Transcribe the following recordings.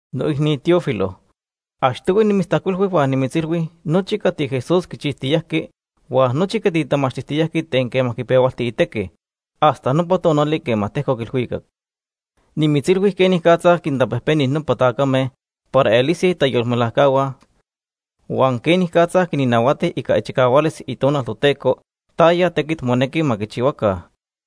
Noicni Teófilo, achtohui nimitztajcuilhui huan nimitzilhui nochi cati Jesús quichijtiyajqui huan nochi cati tamachtijtiyajqui ten quema quipehualti itequi, hasta nopa tonali quema tejcoc ilhuicac. Nimitzilhui quenicatza quintapejpeni nopa tacame para elise itayolmelajcahua huan quenicatza quinnahuati ica ichicahualis Itonal Toteco taya tequit monequi ma quichihuaca.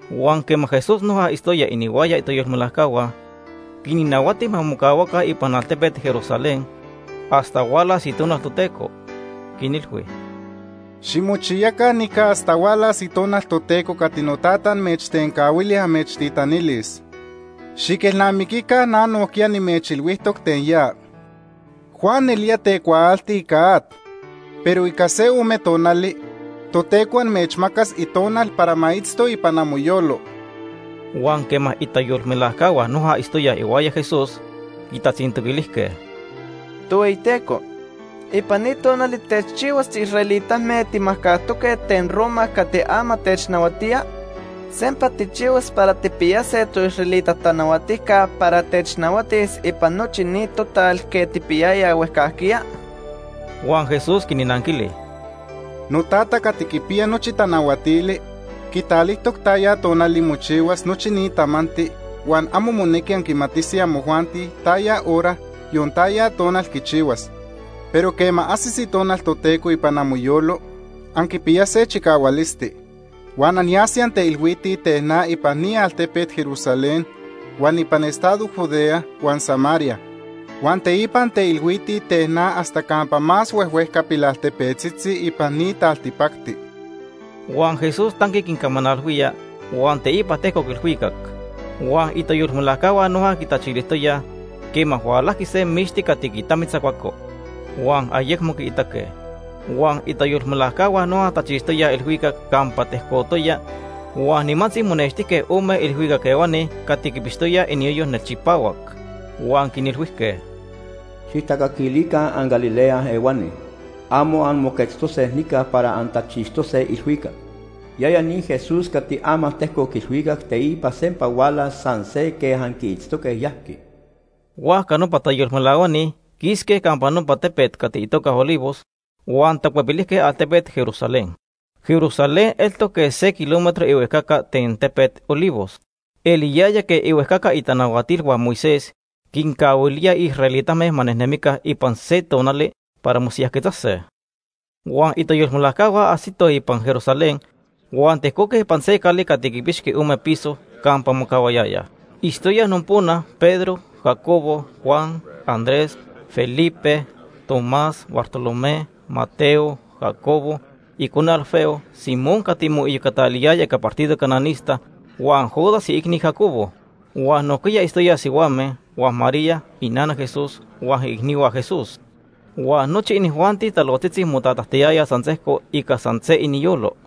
Huan quema Jesús noja itztoya inihuaya itayolmelajcahua, quinnahuati ma mocahuaca ipan altepet Jerusalén hasta hualas Itonal Toteco. Quinilhui: ―Ximochiyaca nica hasta hualas Itonal Toteco cati Notata amechtencahuili amechtitanilis. Xiquelnamiquica na nojquiya nimechilhuijtoc ten ya. Juan nelía tecuaalti ica at, pero ica se ome tonali Toteco amechmacas Itonal para ma itzto ipan amoyolo. Huan quema itayolmelajcahua noja itztoyaj ihuaya Jesús quitatzintoquilijque: ―Tohueyiteco, ¿ipan ni tonali techchihuas tiisraelitame timajcajtoque ten Roma cati ama technahuatía? ¿Sempa tijchihuas para tijpiyase toisraelita tanahuatijca para technahuatis ipan nochi ni total quej tijpiyayayaj huejcajquiya? Huan Jesús quinnanquili: ―NoTata cati quipiya nochi tanahuatili quitalijtoc taya tonali mochihuas nochi ni tamanti huan amo monequi anquimatise amojuanti taya hora, yon taya tonal quichihuas. Pero quema ajsis Itonal Toteco ipan amoyolo, anquipiyase chicahualisti. Huan anyase anteilhuitij ten na ipan ni altepet Jerusalén, huan ipan estado Judea huan Samaria. Huan teipa anteilhuitij ten na hasta campa más huejhuejca pilaltepetzitzi ipan ni taltipacti. Huan Jesús tanqui quincamanalhuía, huan teipa tejcoc ilhuicac. Huan itayolmelajcahua noja quitachilijtoyaj quema hualajqui se mixti cati quitamitzacuaco. Huan ayecmo quiitaque. Huan itayolmelajcahua noja tachixtoyaj ilhuicac campa tejcotoya huan nimantzi monextijque ome ilhuicac ehuani cati quipixtoyaj iniyoyo nelchipahuac. Huan quinilhuijque: ―Xijtacaquilica anGalilea ehuani, amo anmoquetztose nica para antachixtose ilhuicac. Yaya ni Jesús cati ama tejcoc ilhuicac teipa sempa hualas san se quej anquiitztoque yajqui. Huajca nopa tayolmelahuani quisque campa nopa tepet cati itoca Olivos, huan tacuepilijque altepet Jerusalén. Jerusalén eltoc quej se kilómetro ihuejcaca ten tepet Olivos. Eliyaya quej ihuejcaca itanahuatilhua Moisés quincahuilíaj israelitame ma nejnemica ipan se tonali para mosiyajquetzase. Huan itayolmelajcahua ajsitoj ipan Jerusalén huan tejcoque ipan se cali cati quipixqui ome piso campa mocahuayayaj. Itztoyaj nopona Pedro, Jacobo, Juan, Andrés, Felipe, Tomás, Bartolomé, Mateo, Jacobo icone Alfeo, Simón cati moiyocanequiyaya ica partido cananista huan Judas, iicni Jacobo. Huan nojquiya itztoyaj sihuame huan María, inana Jesús, huan iicnihua Jesús. Huan nochi inijuanti talojtzitzi motatajtiyayaj san sejco ica san se iniyolo.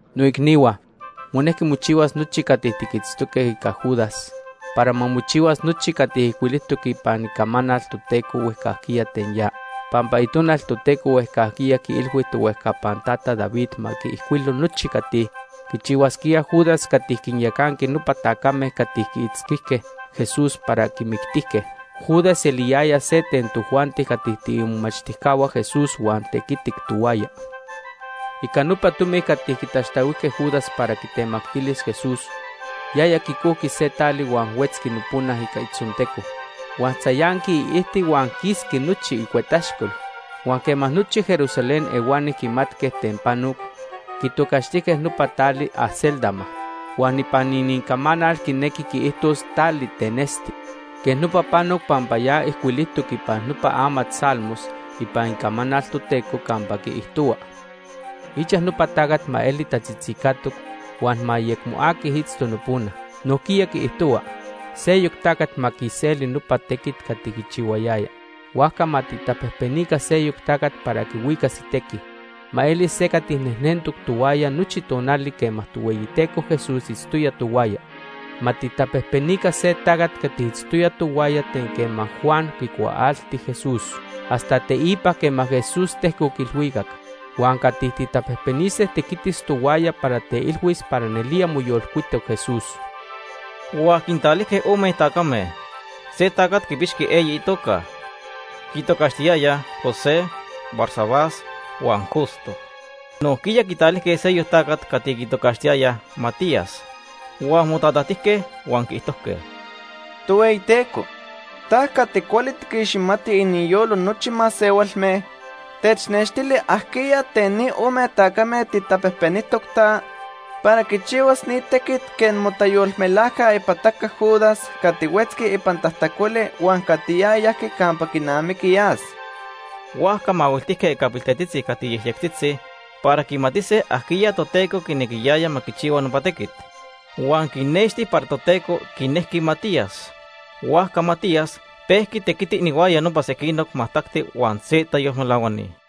“Noicnihua, monejqui mochihuas nochi cati tiquitztoque ica Judas para ma mochihuas nochi cati ijcuilijtoc ipan Icamanal Toteco huejcajquiya ten ya. Pampa Itonal Toteco huejcajquiya quiilhui tohuejcapan tata David ma quiijcuilo nochi cati quichihuasquía Judas cati quinyacanqui nopa tacame cati quiitzquijque Jesús para quimictijque. Judas eliyaya se ten tojuanti cati tiimomachtijcahua Jesús huan tequitic tohuaya. Ica nopa tomi cati quitaxtahuijque Judas para quitemactilis Jesús, yaya quicojqui se tali huan huetzqui nopona ica itzonteco. Huan tzayanqui iijti huan quisqui nochi icuetaxcol. Huan quema nochi Jerusalén ehuani quimatque ten panoc, quitocaxtijque nopa tali ‘Acéldama’, huan ipan inincamanal quinequi quiijtos ‘Tali ten Esti’. Quej nopa panoc pampa ya ijcuilijtoc ipan nopa amat Salmos ipan Icamanal Toteco campa quiijtohua: ‘Ichaj nopa tacat ma eli tatzitzicatoc huan ma ayecmo aqui itzto nopona.’ Nojquiya quiijtohua: ‘Seyoc tacat ma quiseli nopa tequit cati quichihuayaya.’ “Huajca ma tijtapejpenica seyoc tacat para quihuicas itequi. Ma elis se cati nejnentoc tohuaya nochi tonali quema Tohueyiteco Jesús itztoya tohuaya. Ma tijtapejpenica se tacat cati itztoya tohuaya ten quema Juan quicuaalti Jesús hasta teipa quema Jesús tejcoc ilhuicac. Huan cati tijtapejpenise tequitis tohuaya para teilhuis para nelía moyolcuitoc Jesús.” Huan quintalijque ome tacame. Se tacat quipixqui eyi itoca. Quitocaxtiyayaj José, Barsabás huan Justo. Nojquiya quitalijque seyoc tacat cati quitocaxtiyayaj Matías. Huan motatajtijque huan quiijtojque: “Tohueyiteco, ta cati cuali tiquixmati iniyolo nochi masehualme. Technextili ajquiya ten ni ome tacame tijtapejpenijtoc ta, para quichihuas ni tequit quej motayolmelajca ipataca Judas cati huetzqui ipan tajtacoli huan cati ya yajqui campa quinamiqui yas.” Huajca mahuiltijque ica piltetzitzi cati yejyectzitzi para quimatise ajquiya Toteco quinequiyaya ma quichihua nopa tequit. Huan quinexti para Toteco quinejqui Matías. Huajca Matías pejqui tequiti inihuaya nopa sequinoc majtacti huan se tayolmelahuani.